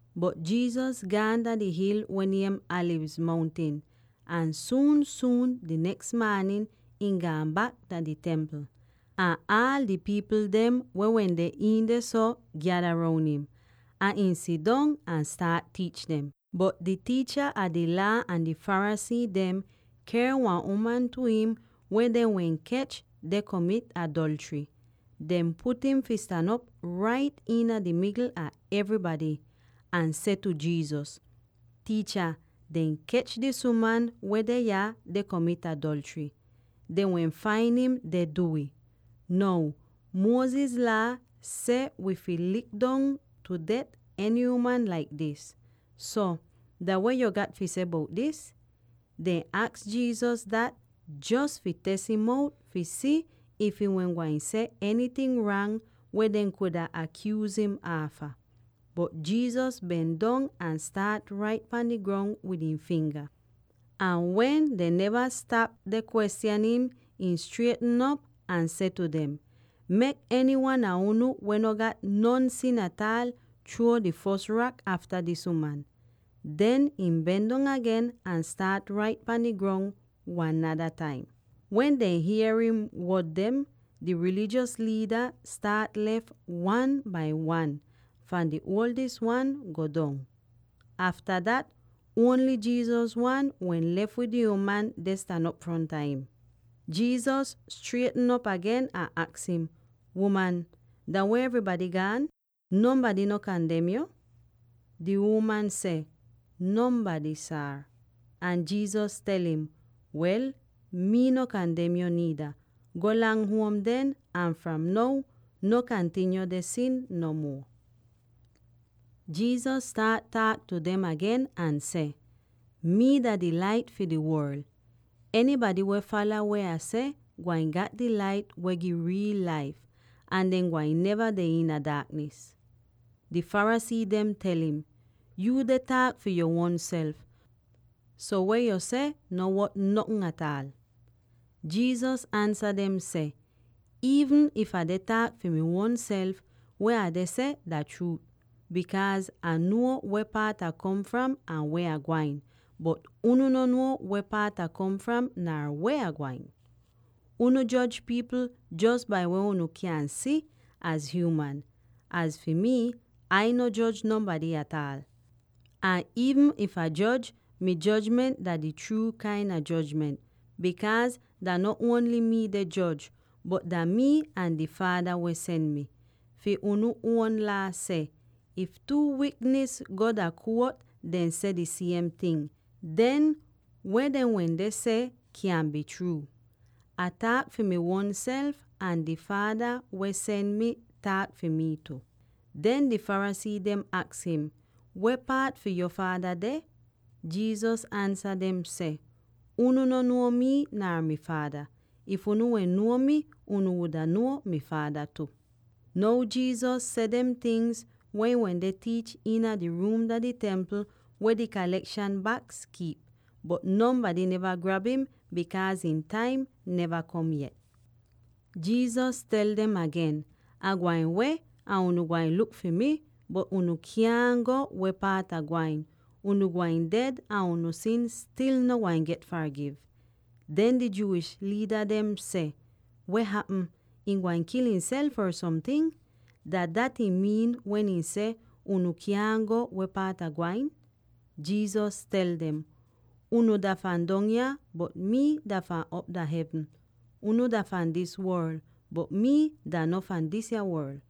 Bot Jesus gaan dah di hil weh niem Alivz Mountin, ahn suun-suun di neks maanin ihn gaan bak dah di Templ. Ahn aal di pipl dem weh wende iin dehso gyada roun im; ahn ihn sidong ahn staat tiich dem. Bot di tiicha a di Laa ahn di Pharisee dem ker wan uman tu im weh dehn wehn kech deh komit adolchry. Dehn put im fi stan op rait iina di migl a evrybady, ahn seh tu Jesus, “Tiicha, dehn kech dis uman weh deh yah deh komit adolchry; dehn wehn fain im deh du'ih. Now, Moses Laa seh wi fi lik dong tu det eny uman laik dis. So, dah weh yuu gat fi seh bout dis?” Dehn aks Jesus dat jos fi tes'im out fi si if ihn wehn gwain seh enyting rang weh dehn kuda akyuuz im aafa. Bot Jesus ben dong ahn staat rait pahn di grong wid ihn finga. Ahn wen dehn neva stap deh kwestyan im, ihn strietn op ahn seh tu dem, “Mek enywan a unu weh no gat non sin ataal chruo di fos rak aafta dis uman.” Den ihn ben dong agen ahn staat rait pahn di grong wan nada taim. Wen dehn hier ihn wod dem, di rilijos liida staat lef wan bai wan, fahn di uoldis wan go dong. Afta dat, ongl Jesus wan wehn lef wid di uman deh stan op fronta im. Jesus strietn op agen ahn aks im, “Uman, dah weh evrybady gaan? Nonbady no kandem yo?” Di uman seh, “Nonbady, Saar.” Ahn Jesus tel im, “Wel, mii no kandem yo niida. Golang huom den, ahn fram now, no kantinyo deh sin no muo.” Jesus staat taak tu dem agen ahn seh, “Mii dah di Lait fi di Worl. Enybady weh fala weh Ah seh gwain gat di lait weh gi riil laif, ahn dehn gwain neva deh iina di daaknis.” Di Pharisee dem tel im, “Yuu deh taak fi yuu uonself; so weh yo seh no wot notn ataal.” Jesus ansa dem seh, “Iivn if Ah deh taak fi mi uonself, weh Ah deh seh dah chruu, bikaaz Ah nuo weh paat Ah kom fram ahn weh Ah gwain. Bot unu no nuo weh paat Ah kom fram nar weh Ah gwain. Unu joj pipl jos bai weh unu kyan si az hyuuman. Az fi mii, Ai no joj nonbady ataal. Ahn iivn if Ah joj, mi jojment dah di chruu kain a jojment, bikaaz dah no ongl mii deh joj, bot dah mii ahn di Faada weh sen mi. Fi unu uon Laa seh, if two wiknis go dah kuot deh seh di siem ting, den weh dehn seh kyan bii chruut. Ah taak fi mi uonself, ahn di Faada weh sen mi taak fi mii tu.” Den di Pharisee dem aks im, “Weh paat fi yo faada deh?” Jesus ansa dem seh, “Unu no nuo mii nar mi Faada. If unu wehn nuo mii, unu wuda nuo mi Faada tu.” Now Jesus seh dem tingz wen ihn wende tiich iina di ruum dah di Templ weh di kalekshan baks kiip. Bot nonbady neva grab im, bikaaz ihn taim neva kom yet. Jesus tel dem agen, “Ah gwain weh ahn unu gwain luk fi mi, bot unu kyaahn go weh paat Ah gwain; unu gwain ded ahn unu sin stil no gwain get fargiv.” Den di Jewish liida dem seh, “Weh hapm? Ihn gwain kil ihnself or somting? Dah dat ihn miin wen ihn seh, ‘Unu kyaahn go weh paat Ah gwain’?” Jesus tel dem, “Unu dah fahn dong yah; bot mii dah fahn op dah hevn. Unu dah fahn dis worl; bot mii dah no fahn disya worl.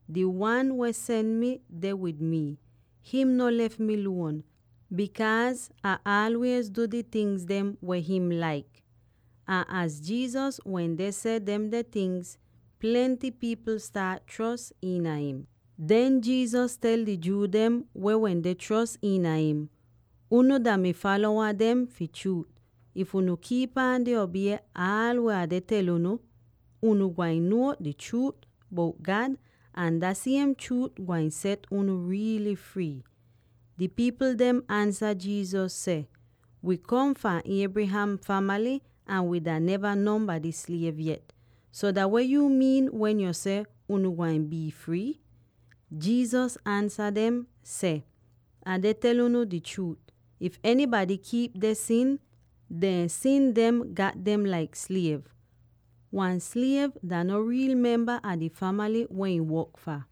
Di Wan weh sen mi deh wid mii. Him no lef mi luon, bikaaz Ah aalwiez du di tingz dem weh him laik.” Ahn az Jesus wende seh demde tingz, plenty pipl staat chros iina im. Den Jesus tel di Jew dem weh wende chros iina im, “Unu dah mi falowa fi chruut, if unu kiip aan deh obie aal weh Ah deh tel unu. Unu gwain nuo di chruut bout God, ahn dah siem chruut gwain set unu riily frii.” Di pipl dem ansa Jesus seh, “Wii kom fahn Abraham famaly, ahn wii dah neva nonbady sliev yet. So dah weh yuu miin wen yo seh, ‘Unu gwain bii frii’?” Jesus ansa dem seh, “Ah deh tel unu di chruut: if enybady kiip deh sin, dehn sin gat dem laik sliev. Wan sliev dah no riil memba a di famaly weh ihn work fah;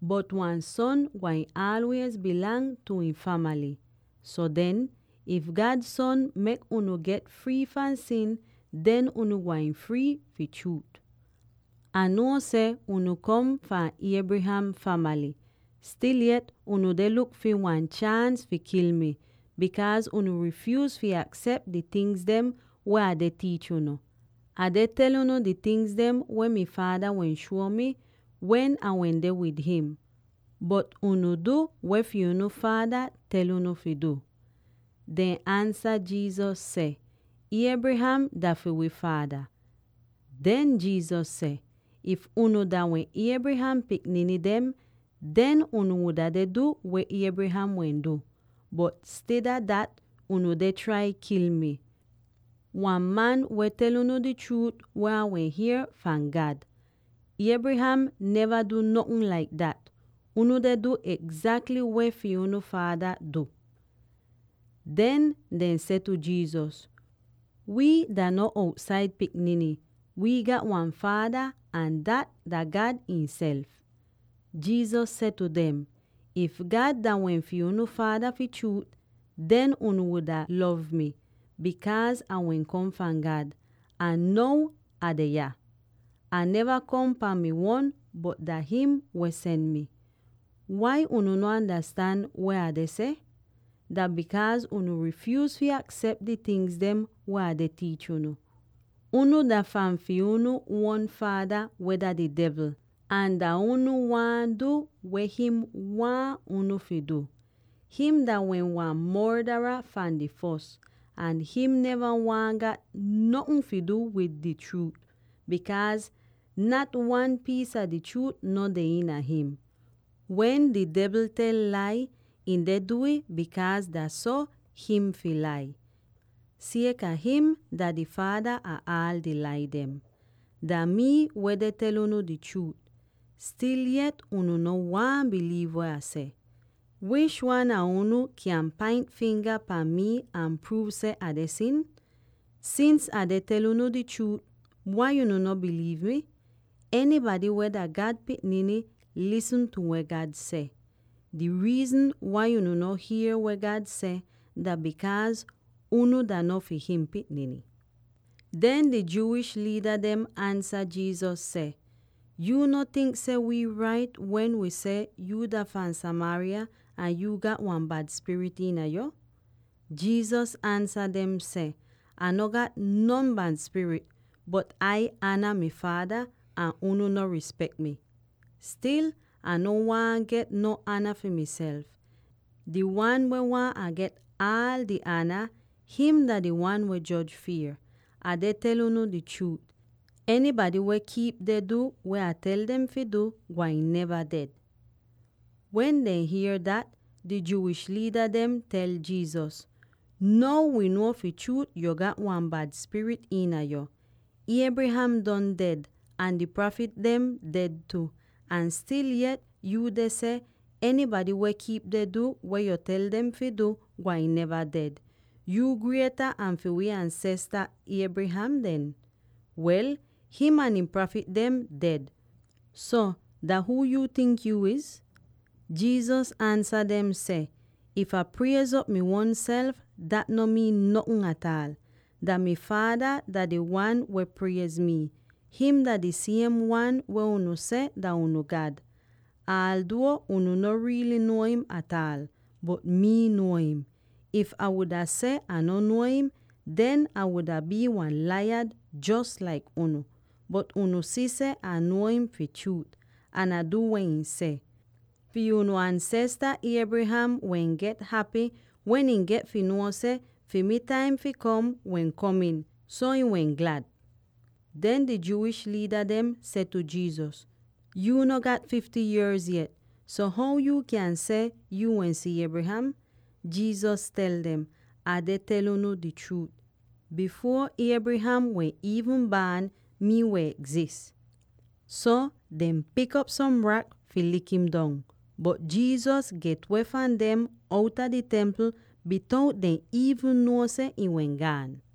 bot wan son gwain aalwiez bii fi ihn famaly. So den, if God Son mek unu get frii fahn sin, den unu gwain frii, fi chruut. Ah nuo seh unu kom fahn Abraham famaly; stil yet unu deh luk fi wan chaans fi kil mi, bikaaz unu rifyuuz fi aksep di tingz dem weh Ah deh tiich unu. Ah deh tel unu di tingz dem weh mi Faada wehn shuo mi, wen Ah wende wid him; bot unu du weh fi unu faada tel unu fi du.” Dehn ansa Jesus seh, “Abraham dah fi wi faada.” Den Jesus seh, “If unu dah wehn Abraham pikniny dem, den unu wuda deh du weh Abraham wehn du, bot insida dat, unu deh trai kil mii —wan man weh tel unu di chruut weh Ah wehn hier fahn God. Abraham neva du notn laik dat. Unu deh du egzakly weh fi unu faada du!” Den dehn seh tu Jesus, “Wii dah no outsaid pikniny; wii gat wan faada, ahn dat dah God ihnself.” Jesus seh tu dem, “If God dah wehn fi unu faada fi chruut, den unu wuda lov mii, bikaaz Ah wehn kom fahn God, ahn now Ah deh yah. Ah neva kom pahn mi uon, bot dah him wehn sen mi. Wai unu no andastan weh Ah deh seh? Dah bikaaz unu rifyuuz fi aksep di tingz dem weh Ah deh tiich unu. Unu dah fi unu uon faada weh dah di devl; ahn dah unu waahn du weh him waahn unu fi du. Him dah wehn wan mordara fahn di fos, ahn him neva waahn gat notn fi du wid di chruut, bikaaz nat wan piis a chruut deh iina him. Wen di devl tel lai, ihn deh du'ih bikaaz dah so him fi lai, sieka him dah di faada ah aal di lai dem. Dah mii weh deh tel unu di chruut; stil yet unu no waahn biliiv weh Ah seh. Wish wan a unu kyan paint finga pahn mii ahn pruuv seh Ah deh sin? Sins Ah deh tel unu di chruut, wai unu no biliiv mi? Enybady weh dah God pikniny lisn tu weh God seh. Di riizn wai unu no hier weh God seh, dah bikaaz unu dah no fi him pikniny.” Den di Jewish liida dem ansa Jesus seh, “Yuu no tink seh wii rait wen wii seh yuu dah fahn Samaria ahn yuu gat wan bad spirit iina yo?” Jesus ansa dem seh, “Ah no gat non bad spirit, bot Ai ana mi Faada, ahn unu no rispek mii. Stil, Ah no waahn get no ana fi miself; di Wan weh waahn Ah get aal di ana, him dah di Wan weh joj fier. Ah deh tel unu di chruut: enybady weh kiip deh du weh Ah tel dem fi du, gwain neva ded.” Wen dehn hier dat, di Jewish liida dem tel Jesus, “Now wi nuo fi chruut yuu gat wan bad spirit iina yo! Abraham don ded, ahn di prafit dem ded tu, ahn stil yet yu deh seh enybady weh kiip deh du weh yu tel dem fi du gwain neva ded. Yuu grieta an fi wii ansesta Abraham den? Wel, him ahn di prafit dem ded. So, dah huu yuu tink yuu iz?” Jesus ansa dem seh, “If Ah priez'op mi uonself, dat no miin notn ataal. Dah mi Faada dah di Wan weh priez mii. Him dah di siem Wan weh unu seh dah unu God, alduo unu no riily nuo im ataal. Bot mii nuo him. If Ah wuda seh Ah no nuo im, den Ah wuda bii wan laiyad jos laik unu. Bot unu si seh Ah nuo im fi chruut, ahn Ah du weh ihn seh. Fi unu ansesta Abraham wehn get hapy wen ihn get fi nuo seh fi mi taim fi kom wehn kom'in, so ihn wehn glad.” Den di Jewish liida dem seh tu Jesus, “Yuu no gat fifty yierz yet, so how yuu kyan seh yo wehn si Abraham?” Jesus tel dem, “Ah deh tel unu di chruut: bifuor Abraham wehn iivn baan, mii wehn egzis!” So dehn pik op som rak fi lik'im dong, bot Jesus get-weh fahn dem outa di Templ bitout dehn iivn nuo seh ihn wehn gaan.